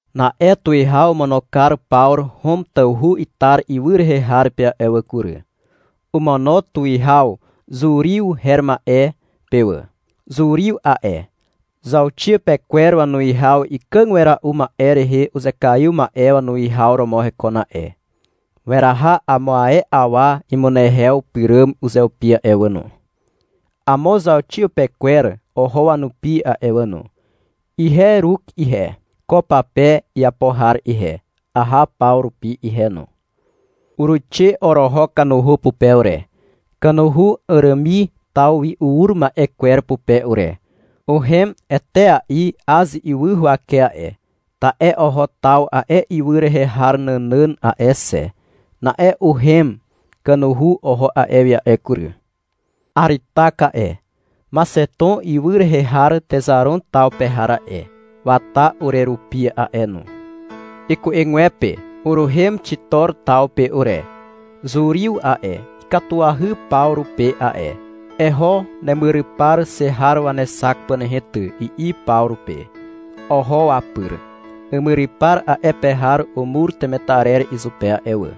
Na'e tuwihaw omono kar Pawru Hom tawhu Itar ywy rehe har pe a'e wà kury. Omono tuwihaw Zuriw her ma'e pe wà. Zuriw a'e, zauxiapekwer wanuwihaw ikàg wera'u ma'e rehe uzekaiw ma'e wanuwihaw romo hekon a'e. Weraha amo ae awa imunehew pyràm uzeupi a'e wà no. (Amo zauxiapekwer oho wanupi a'e wà no. Ihe Iruk ihe, ko pape iapo har ihe, aha Pawru rupi ihe no.) Uruixe oroho kanuhu pupe ure, kanuhu Àràmi taw wi ur ma'e kwer pupe ure. Uhem etea'i Az ywy huwake a'e, ta'e oho taw a'e ywy rehe har nànàn a'e xe. Na'e uhem kanuhu oho a'e wi a'e kury. Aritak a'e, Maxeton ywy rehe har Texaron taw pe har a'e, wata urerupi a'e no. Iku'egwepe uruhem Xitor taw pe ure. Zuriw a'e, ikatuahy Pawru pe a'e. — Eho nemyrypar xe har wanexak pà nehe ty, i'i Pawru pe. Oho wapyr. Imyrypar a'e pe har umur temetarer izupe a'e wà.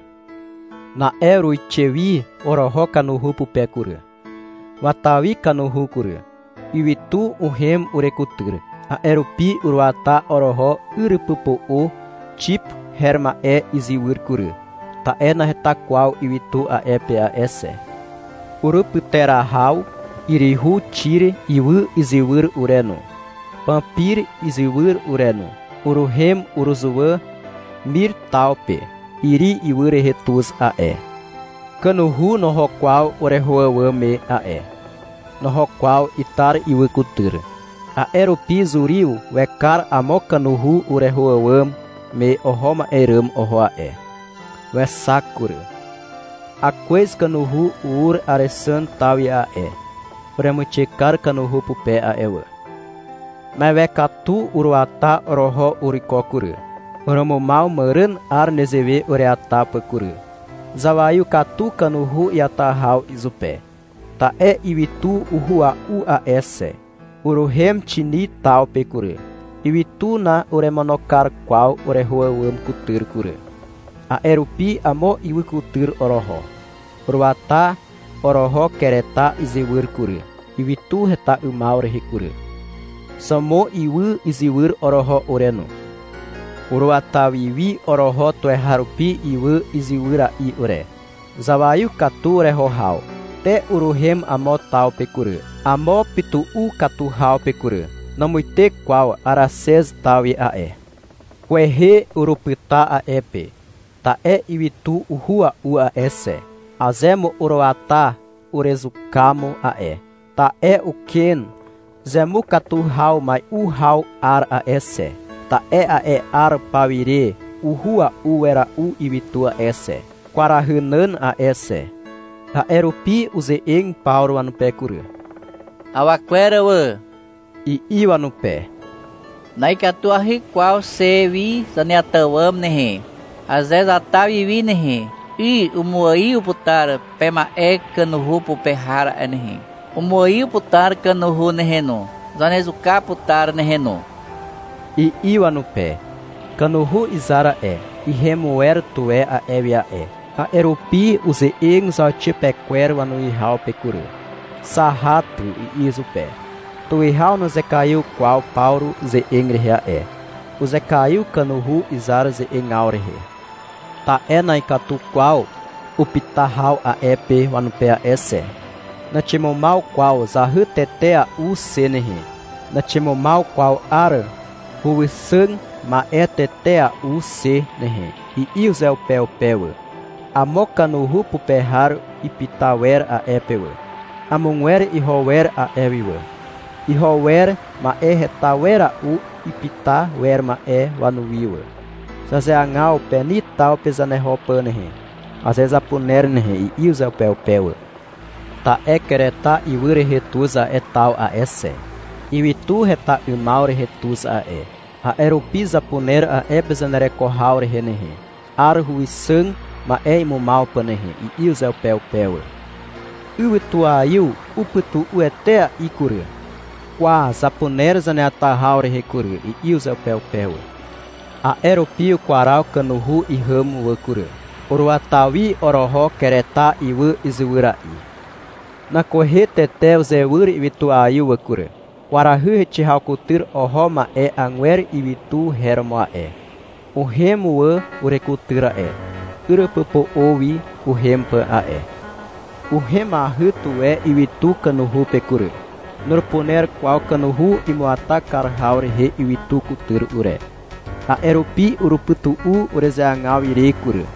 (Na'e uruixe wi oroho kanuhu pupe kury.) Wata wi kanuhu kury. Ywytu uhem urekutyr. A'e rupi uruata oroho yrypypo'o Xip her ma'e izywyr kury, ta'e naheta kwaw ywytu a'e pe a'e xe. Urupyterahaw yryhu Xiri ywy izywyr ure no, Pampir izywyr ure no. Uruhem uruzuwà Mir taw pe. Iri ywy rehe tuz a'e. Kanuhu noho kwaw ureho àwàm me a'e. Noho kwaw Itar ywy kutyr. A'e rupi Zuriw wekar amo kanuhu ureho àwàm me oho ma'e ràm oho a'e. Wexak kury. (Akwez kanuhu ur Àrexàn taw wi a'e.) Uremuixe kar kanuhu pupe a'e wà. Mewe katu uruata oroho uruiko kury. Urumumaw màràn 'ar nezewe ureata pà kury. Zawaiw katu kanuhu iata haw izupe, ta'e ywytu uhua'u a'e xe. Uruhem Xini taw pe kury. Ywytu na'uremono kar kwaw ureho àwàm kutyr kury. A'e rupi amo ywy kutyr oroho. Uruata oroho Kereta izywyr kury, ywytu heta 'ymaw rehe kury. Xàwmon ywy izywyr oroho ure no. Uruata wi wi oroho tuweharupi ywy izywyra'i ure. Zawaiw katu ureho haw. Te uruhem amo taw pe kury, amo pytu'u katu haw pe kury. Namuite kwaw Araxez taw wi a'e. Kwehe urupyta a'e pe. Ta'e ywytu uhua'u a'e xe. Aze mo uruata, urezuka mo a'e. Ta'e ukwen zemukatu haw mai'u haw 'ar a'e xe. Ta'e a'e 'ar paw ire uhua'u wera'u ywytu a'e xe, kwarahy nàn a'e xe. A'e rupi uze'eg Pawru wanupe kury. — Awa kwer wà, i'i wanupe. — Na'ikatuahy kwaw xe wi zaneata àwàm nehe. Aze zata wi wi nehe, 'y umuaiw putar pema'e kanuhu pupe har a'e nehe. Umuaiw putar kanuhu nehe no. Zanezuka putar nehe no, i'i wanupe. Kanuhu izar a'e, ihem wer tuwe a'e wi a'e. A'e rupi uze'eg zauxiapekwer wanuwihaw pe kury. — Zaha ty, i'i izupe. Tuwihaw nuzekaiw kwaw Pawru ze'eg rehe a'e. Uzekaiw kanuhu izar ze'egaw rehe. Ta'e na'ikatu kwaw upyta haw a'e pe wanupe a'e wà xe. — Naximumaw kwaw zahy tetea'u xe nehe, naximumaw kwaw 'ar huwixàg ma'e tetea'u xe nehe, i'i uzeupeupe wà. Amo kanuhu pupe har ipyta wer a'e pe wà. Amogwer iho wer a'e wi wà. Iho wer ma'e heta wera'u ipyta wer ma'e wanuwi wà. — Zazeagaw Peni taw pe zaneho pà nehe, aze zapuner nehe, i'i uzeupeupe wà. — Ta'e Kereta ywy rehe tuz a'e taw a'e xe. Ywytu heta 'ymaw rehe tuz a'e. A'e rupi zapuner a'e pe zanereko haw rehe nehe, 'ar huwixàg ma'e imumaw pà nehe, i'i uzeupeupe wà. Ywytuaiw upytu'u etea'i kury. — Kwa, zapuner zaneata haw rehe kury, i'i uzeupeupe wà. A'e rupi ukwaraw kanuhu ihàm wà kury. Uruata wi oroho, Kereta ywy izywyra'i. Nan kwehe tete uzewyr ywytuaiw wà kury. Kwarahy heixe haw kutyr oho ma'e agwer ywytu her romo a'e. Uhem wà urekutyr a'e, yrypypo'o wi uhem pà a'e. Uhemahy tuwe ywytu kanuhu pe kury. Nurupuner kwaw kanuhu imuata kar haw rehe ywytu kutyr ure, a'e rupi urupytu'u urezeagaw ire kury.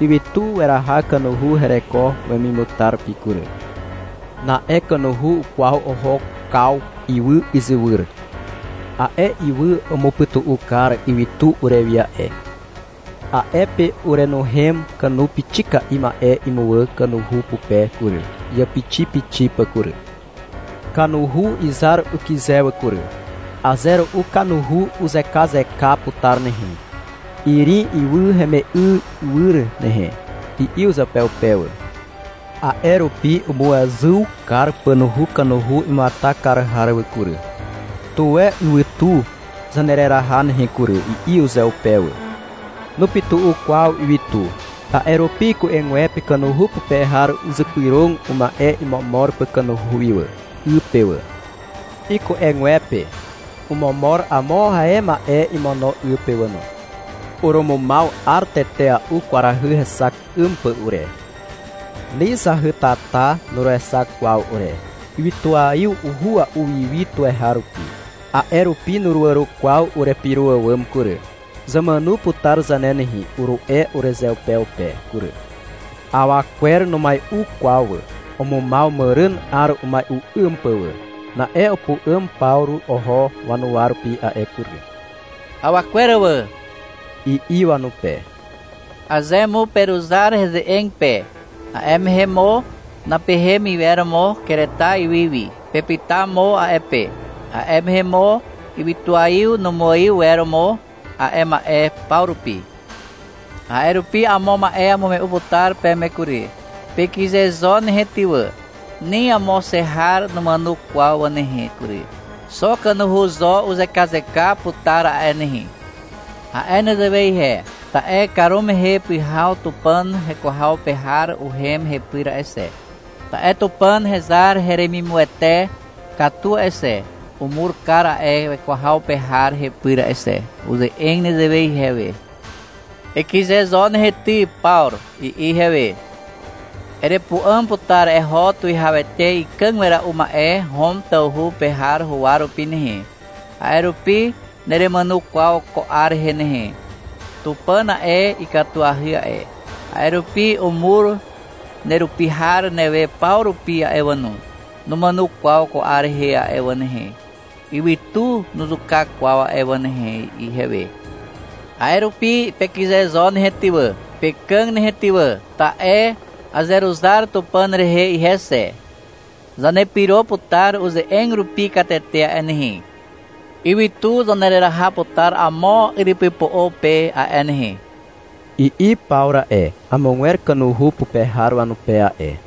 Ywytu weraha kanuhu hereko wemimutar rupi kury. Na'e kanuhu ukwaw oho Kaw ywy izywyr. A'e ywy umupytu'u kar ywytu urewi a'e. A'e pe uruenuhem kanu pixika'i ma'e imuwà kanuhu pupe kury, iàpixipixi pà kury. Kanuhu izar ukyze wà kury. — Aze ru'u kanuhu uzekazeka putar nehe, Irim ywy heme'ywyr nehe, i'i uzeupeupe wà. A'e rupi umuezyw kar pànuhu kanuhu imuata kar har wà kury. — Tuwe ywytu zanereraha nehe kury, i'i uzeupe wà. Nupytu'u kwaw ywytu. A'e rupi iku'egwepe kanuhu pupe har uzypyrog uma'e imomor pà kanuhu wi wà, 'y pe wà. Iku'egwepe omomor amo ae uma'e imono 'y pe wà no. Urumumaw 'ar tetea'u kwarahy hexak 'ym pà ure. Ni zahytata nuruexak kwaw ure. Ywytuaiw uhua'u wi wi tuweharupi. A'e rupi nuruàro kwaw urepyro àwàm kury. — Zamàno putar zane nehe, uru'e urezeupeupe kury. Awa kwer numai'u kwaw wà. Umumaw màràn 'ar umai'u 'ym pà wà. Na'e upu'àm Pawru oho wanuwa rupi a'e kury. — Awa kwer wà, i'i wanupe. — Aze mo peruzar heze'eg pe, a'e mehe mo napehem iwer mo Kereta ywy wi. Pepyta mo a'e pe. A'e mehe mo ywytuaiw numuaiw iwer mo a'e ma'e paw rupi. A'e rupi amo ma'e amume'u putar peme kury. — Pekyze zo nehe ty wà. Ni amo xe har numàno kwaw wà nehe kury. Xo kanuhu zo uzekazeka putar a'e nehe. A'e nezewe ihe, ta'e karumehe pyhaw Tupàn heko haw pe har uhem hepyr a'e xe. Ta'e Tupàn hezar heremimuwete katu a'e xe, umur kar a'e weko haw pe har hepyr a'e xe. Uze'eg nezewe ihewe. — Ekyze zo nehe ty, Pawru, i'i ihewe. — Erepu'àm putar eho tuwihawete ikàg wera'u ma'e Hom tawhu pe har huwa rupi nehe. A'e rupi neremàno kwaw ko 'ar rehe nehe. Tupàn a'e, ikatuahy a'e, a'e rupi umur nerupi har newe paw rupi a'e wà no. Numàno kwaw ko 'ar rehe a'e wà nehe. Ywytu nuzuka kwaw a'e wà nehe, i'i ihewe. A'e rupi pekyze zo nehe ty wà, pekàg nehe ty wà. Ta'e azeruzar Tupàn rehe ihe xe. Zanepyro putar uze'eg rupi katete a'e nehe. Ywytu zanereraha putar amo yrypypo'o pe a'e nehe, i'i Pawru a'e, amogwer kanuhu pupe har wanupe a'e.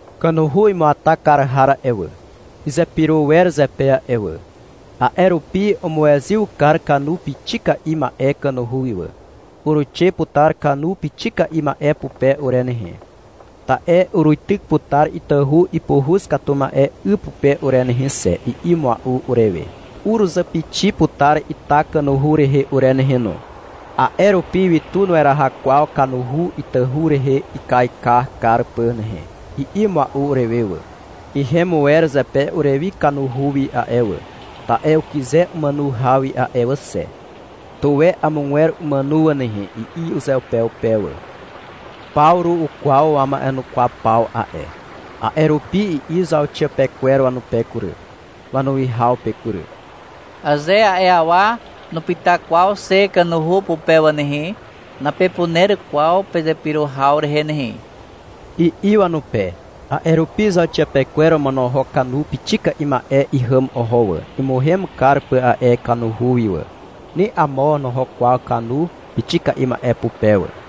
Kanuhu imuata kar har a'e wà, izepyro wer zepe a'e wà. A'e rupi umuezyw kar kanu pixika'i ma'e kanuhu wi wà. — Uruixe putar kanu pixika'i ma'e pupe ure nehe, ta'e uruityk putar itahu ipuhuz katu ma'e 'y pupe ure nehe xe, i'i mua'u urewe. — Uruzàpixi putar ita kanuhu rehe ure nehe no. A'e rupi ywytu nueraha kwaw kanuhu itahu rehe ikaika kar pà nehe, i'i mua'u urewe wà. Ihem wer zepe urewi kanuhu wi a'e wà, ta'e ukyze umàno haw wi a'e wà xe. (-Tuwe amogwer umàno wà nehe, i'i uzeupeupe wà.) Pawru ukwaw wama'enukwaw paw a'e. A'e rupi i'i zauxiapekwer wanupe kury, wanuwihaw pe kury. — Aze a'e awa nupyta kwaw xe kanuhu pupe wà nehe, napepuner kwaw pezepyro haw rehe nehe, i'i wanupe. A'e rupi zauxiapekwer omonohok kanu pixika'i ma'e ihàm oho wà, imuhem kar pà a'e wi kanuhu wi wà. Ni amo noho kwaw kanu pixika'i ma'e pupe wà.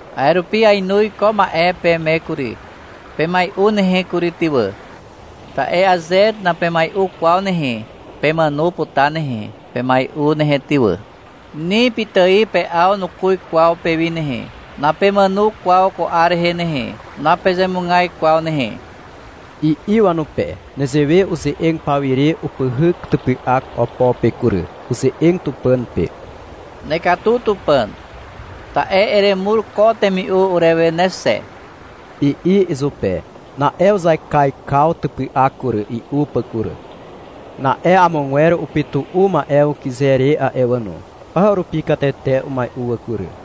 A'e rupi ainoz ko ma'e peme kury. Pemai'u nehe kury, ty wà. Ta'e aze napemai'u kwaw nehe, pemàno putar nehe. Pemai'u nehe ty wà. Ni pitài pe'aw nukuz kwaw pewi nehe. (Napemàno kwaw ko 'ar rehe nehe, napezemugaz kwaw nehe), i'i wanupe. Nezewe uze'eg pawire upyhyk typy'ak opo pe kury. Uze'eg Tupàn pe. — Nekatu Tupàn, ta'e eremur ko temi'u urewe ne xe, i'i izupe. Na'e uzaikaikaw typy'ak kury, i'u pà kury. Na'e amogwer upytu'u ma'e wi ukyze re a'e wà no. Paw rupi katete umai'u wà kury.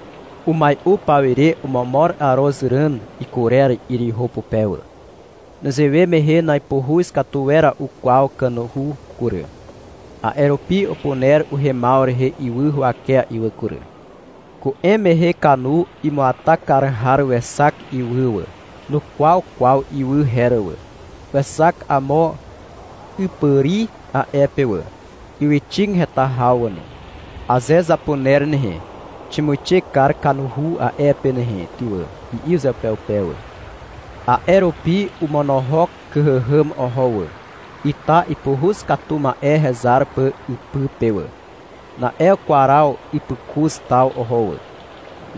Umai'u pawire omomor arozràn ikurer 'yryhu pupe wà. Nezewe mehe na'ipuhuz katu wera'u kwaw kanuhu kury. A'e rupi upuner uhemaw rehe ywy huwakea'i wà kury. Ku'em mehe kanu imuata kar har wexak ywy wà. Nukwaw kwaw ywy her wà. Wexak amo 'ypàri a'e pe wà, ywyxig heta haw wà no. — Aze zapuner nehe, ximuixe kar kanuhu a'e pe nehe ty wà, i'i uzeupeupe wà. A'e rupi omonohok kyhàhàm oho wà, ita ipuhuz katu ma'e hezar pà ypy pe wà. Na'e ukwaraw ypykuz taw oho wà.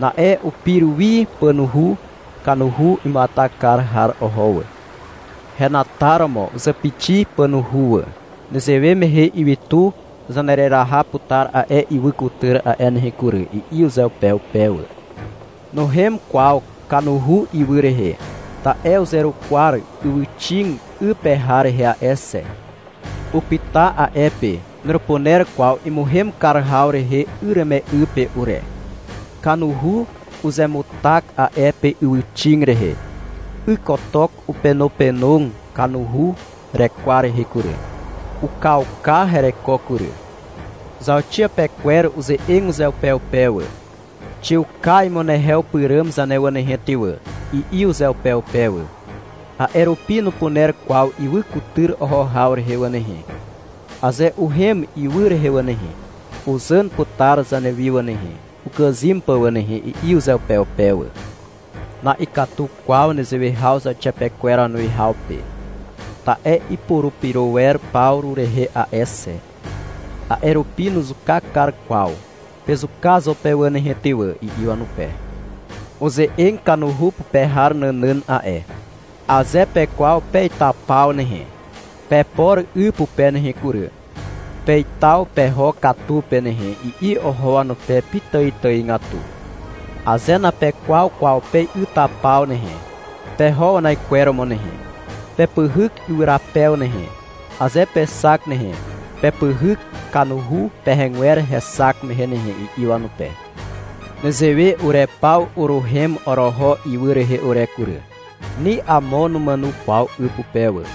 Na'e upir wi pànuhu kanuhu imuata kar har oho wà. Henataromo uzàpixi pànuhu wà. — Nezewe mehe ywytu zanereraha putar a'e ywy kutyr a'e nehe kury, i'i uzeupeupe wà. Nuhem kwaw kanuhu ywy rehe. Ta'e uzerukwar ywyxig 'y pe har rehe a'e xe. Upyta a'e pe. Nurupuner kwaw imuhem kar haw rehe yreme'y pe ure. Kanuhu uzemutak a'e pe ywyxig rehe. Ykotok upenopenog kanuhu rekwar rehe kury. Ukauka hereko kury. Zauxiapekwer uze'eg uzeupeupe wà. — Xiuka imunehew pyràm zane wà nehe ty wà, i'i uzeupeupe wà. — A'e rupi nupuner kwaw ywy kutyr oho haw rehe wà nehe. Aze uhem ywy rehe wà nehe, uzàn putar zanewi wà nehe, ukàzym pà wà nehe, i'i uzeupeupe wà. Na'ikatu kwaw nezewe haw zauxiapekwer wanuwihaw pe. Ta'e ipurupyro wer Pawru rehe a'e xe. A'e rupi nuzuka kar kwaw. — Pezuka zo pe wà nehe ty wà, i'i wanupe. Uze'eg kanuhu pupe har nànàn a'e. — Aze pekwaw pe'ytapaw nehe, pepor 'y pupe nehe kury, pe'ytaw peho katu pe nehe, i'i oho wanupe pitàitàigatu. — Aze napekwaw kwaw pe'ytapaw nehe, peho wanaikweromo nehe. Pepyhyk ywyrapew nehe, aze pexak nehe. Pepyhyk kanuhu pehegwer hexak mehe nehe, i'i wanupe. Nezewe ure paw uruhem oroho ywy rehe ure kury. Ni amo numàno kwaw 'y pupe wà.